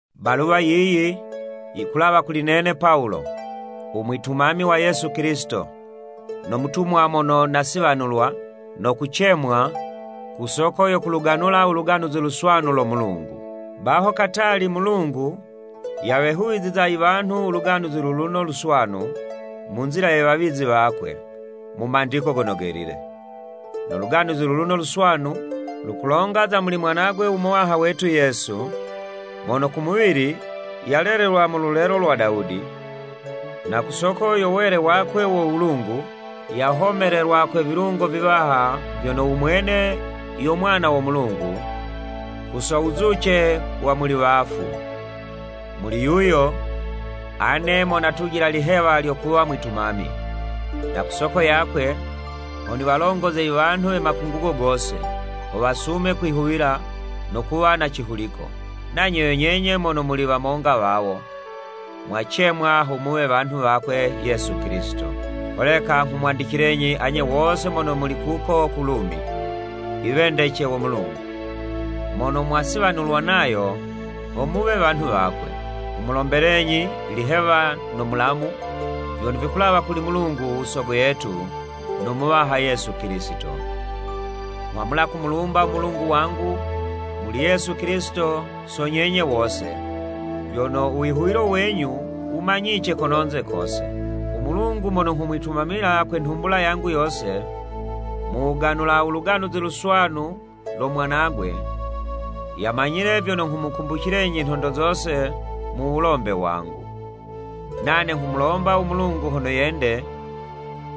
Baluwa yiyi, yikulawa kuli nene Pawulo, u mwitumami wa Yesu Kilisito, no mutumwa mono nasiwanulwa, no kucemwa, ku soko yo kuluganula u Luganuzi Luswanu lo Mulungu. Baho katali Mulungu, yawehuwiziza iwanhu u Luganuzi luluno Luswanu, mu nzila ye wawizi wakwe, mu Mandiko Gono Gelile. No Luganuzi luluno Luswanu, lukulonga za muli Mwanagwe u Muwaha wetu Yesu, mono ku muwili, yalelelwa mu lulelo lwa Dawudi, na ku soko yo wele wakwe wo Wulungu, yahomelelwa kwe vilungo viwaha vyono, u mwene yo Mwana wo Mulungu, ku so wuzuce wa muli wafu. Muli yuyo, ane mo natujila ilihewa lyo kuwa mwitumami. Na ku soko yakwe, ho niwalongoze iwanhu we makungugo gose, ho wasume kwihuwila, no kuwa na cihuliko. Nanye yo nyenye mono muli wamonga wawo, mwacemwa ho muwe wanhu wakwe Yesu Kilisito. Holeka, nghumwandicilenyi anye wose mono muli kuko ku Lumi, iwendece wo Mulungu, mono mwasiwanulwa Nayo ho muwe wanhu wakwe. Nghumulombelenyi ilihewa no mulamu, vyono vikulawa kuli Mulungu u Sogo yetu, no Muwaha Yesu Kilisito. Nghwamula kumulumba u Mulungu wangu, muli Yesu Kilisito so nyenye wose, vyono u wihuwilo wenyu wumanyice kononze kose. U Mulungu mono nghumwitumamila kwe nhumbula yangu yose, mu wuganula u Luganuzi Luswanu lo Mwanagwe, yamanyile vyono nghumukumbucilenyi, nhondo zose mu wulombe wangu. Nane nghumulomba u Mulungu hono yende,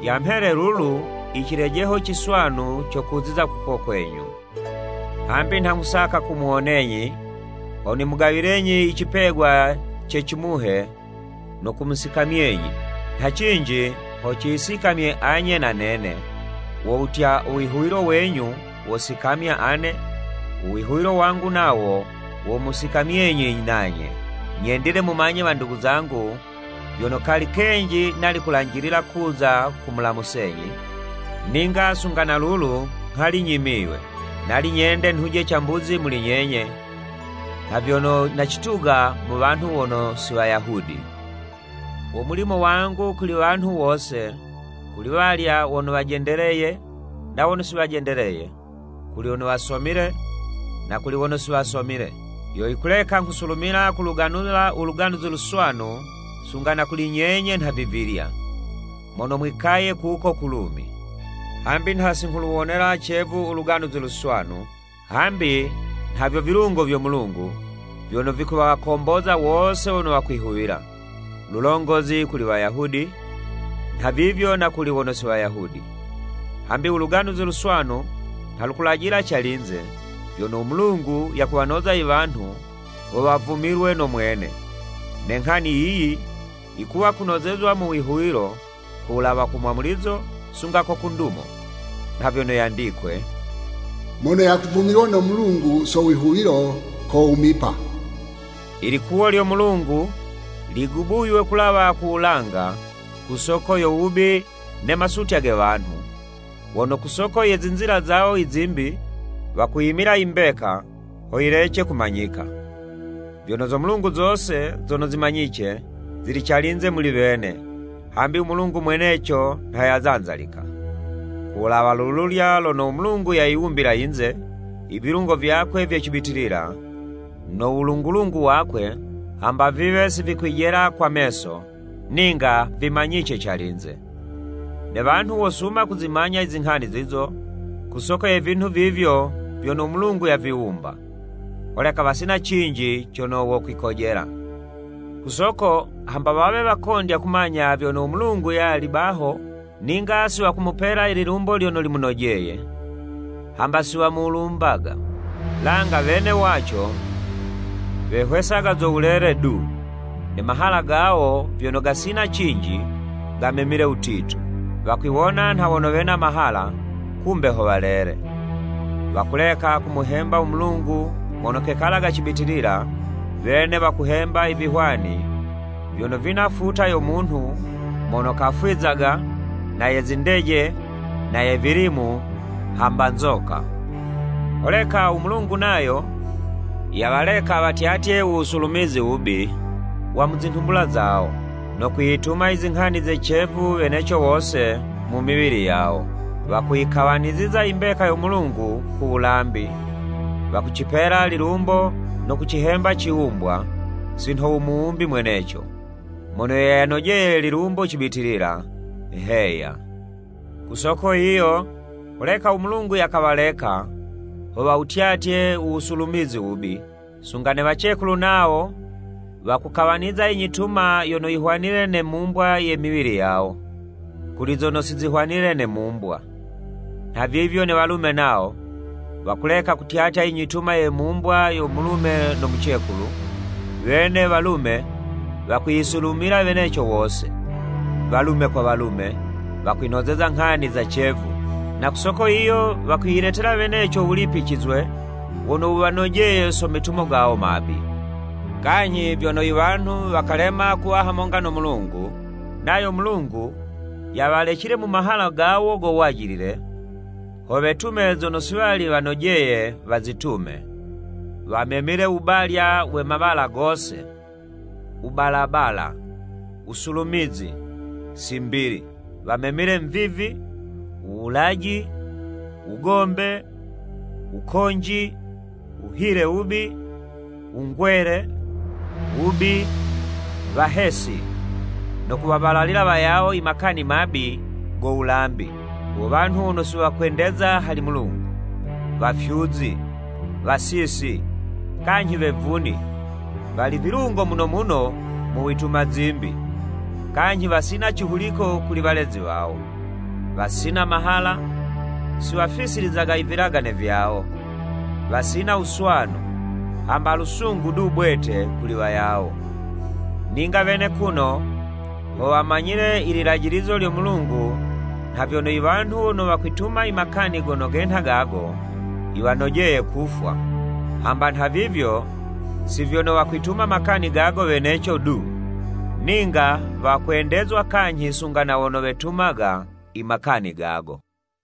yamhele lulu icilejeho ciswanu co kuziza kuko kwenyu. Hambi nha nghusaka kumuwonenyi, ho nimugawilenyi icipegwa ce cimuhe no kumusikamyenyi. Nha cinji ho ciyisikamye anye na nene, wo wutya, uwihuwilo wenyu wosikamya ane, uwihuwilo wangu nawo womusikamyenyi nanye. Nyendile mumanye wandugu zangu vyono, kali kenji nali kulanjilila kuza kumulamusenyi, ninga sunga na lulu nghali nyimiywe. Nali nyende nhuje cambuzi muli nyenye, nha vyono nacituga mu wanhu wono si Wayahudi. Wo mulimo wangu kuli wanhu wose, kuli walya wono wajendeleye na wono si wajendeleye, kuli wono wasomile, na kuli wono si wasomile. Yo yikuleka nghusulumila kuluganula u Luganuzi Luswanu sunga na kuli nyenye nhavivilya, mono mwikaye kuko ku Lumi. Hambi nha si nghuluwonela cevu u Luganuzi Luswanu; hambi nhavyo vilungo vyo Mulungu, vyono vikuwakomboza wose wono wakwihuwila, lulongozi kuli Wayahudi, nha vivyo na kuli wono si Wayahudi. Hambi u Luganuzi Luswanu, nha lukulajila calinze, vyono u Mulungu yakuwanoza iwanhu, ho wavumilwe no mwene, ne nghani yiyi, yikuwa kunozezwa mu wihuwilo, ku wulawa ku mwamulizo, sunga ko ku ndumo. Nha vyono yandikwe, “Mono yakuvumilwa no Mulungu so wihuwilo, kowumipa.” Ilikuwo lyo Mulungu, ligubuywe kulawa ku wulanga ku soko yo wubi ne masutya ge wanhu, wono ku soko ye zinzila zawo izimbi, wakuyimila imbeka, ho yilece kumanyika. Vyono zo Mulungu zose zono zimanyice, zili calinze muli wene, hambi u Mulungu mweneco nha yazanzalika. Ku wulawa lululya lono u Mulungu yayiwumbila yinze, ivilungo vyakwe vye cibitilila, no wulungu-lungu wakwe, hamba viwe si vikwijela kwa meso, ninga vimanyice calinze. Ne wanhu wosuma kuzimanya izinghani zizo, ku soko ye vinhu vivyo vyono u Mulungu yaviwumba. Holeka wasina cinji cono wokwikojela! Ku soko hamba wawe wakondya kumanya vyono u Mulungu yali baho, ninga si wakumupela ililumbo lyono limunojeye, hamba si wamulumbaga. Langa wene waco, wehwesaga zo wulele du, ne mahala gawo vyono gasina cinji, gamemile wutitu. Wakwiwona nha wono wena mahala, kumbe ho walele. Wakuleka kumuhemba u Mulungu mono kekalaga cibitilila, wene wakuhemba ivihwani vyono vina futa yo munhu mono kafwizaga, na ye zindeje, na ye vilimu, hamba nzoka. Holeka u Mulungu nayo, yawaleka watyatye u wusulumizi wubi, wa mu zinhumbula zawo, no kwiyituma izinghani ze cevu weneco wose mu miwili yawo. Wakuyikawaniziza imbeka yo Mulungu ku wulambi, wakucipela lilumbo no kucihemba iciwumbwa, si nho u Muwumbi mweneco, mono yo yanojeye lilumbo cibitilila! Heya. Ku soko yiyo, holeka u Mulungu yakawaleka, ho wawutyatye u wusulumizi wubi. Sunga ne wacekulu nawo wakukawaniza inyituma yono vihwanile ne mumbwa ye miwili yawo, kuli zono si zihwanile ne mumbwa. Nha vivyo ne walume nawo, wakuleka kutyatya inyituma ye mumbwa yo mulume no mucekulu, wene walume wakwiyisulumila weneco wose. Walume kwa walume, wakwinozeza nghani za cevu, na ku soko yiyo, wakwiyiletela weneco u wulipicizwe wono wuwanojeye so metumo gawo mabi. Kanyhi vyono iwanhu wakalema kuwa hamonga no Mulungu, nayo Mulungu yawalecile mu mahala gawo go wajilile, ho wetume zono si wali wanojeye wazitume. Wamemile u wubalya we mawala gose, wubalabala, wusulumizi, simbili. Wamemile mvivi, wuwulaji, wugombe, wukonji, wuhile wubi, wungwele, wubi, wahesi, no kuwabalalila wayawo i makani mabi go wulambi, wo wanhu wono si wakwendeza hali Mulungu, wafyuzi, wasisi, kanyhi wevuni, wali vilungo muno muno mu wituma zimbi, kanyhi wasina cihuliko kuli walezi wawo, wasina mahala, si wafisilizaga ivilagane vyawo, wasina wuswanu, hamba lusungu du bwete kuli wayawo. Ninga wene kuno ho wamanyile i lilajilizo lyo Mulungu nha vyono, iwanhu wono wakwituma i makani gono genha gago, yiwanojeye kufwa. Hamba nhavivyo, si vyono wakwituma makani gago weneco du, ninga wakwendezwa kanyhi sunga na wono wetumaga imakani gago.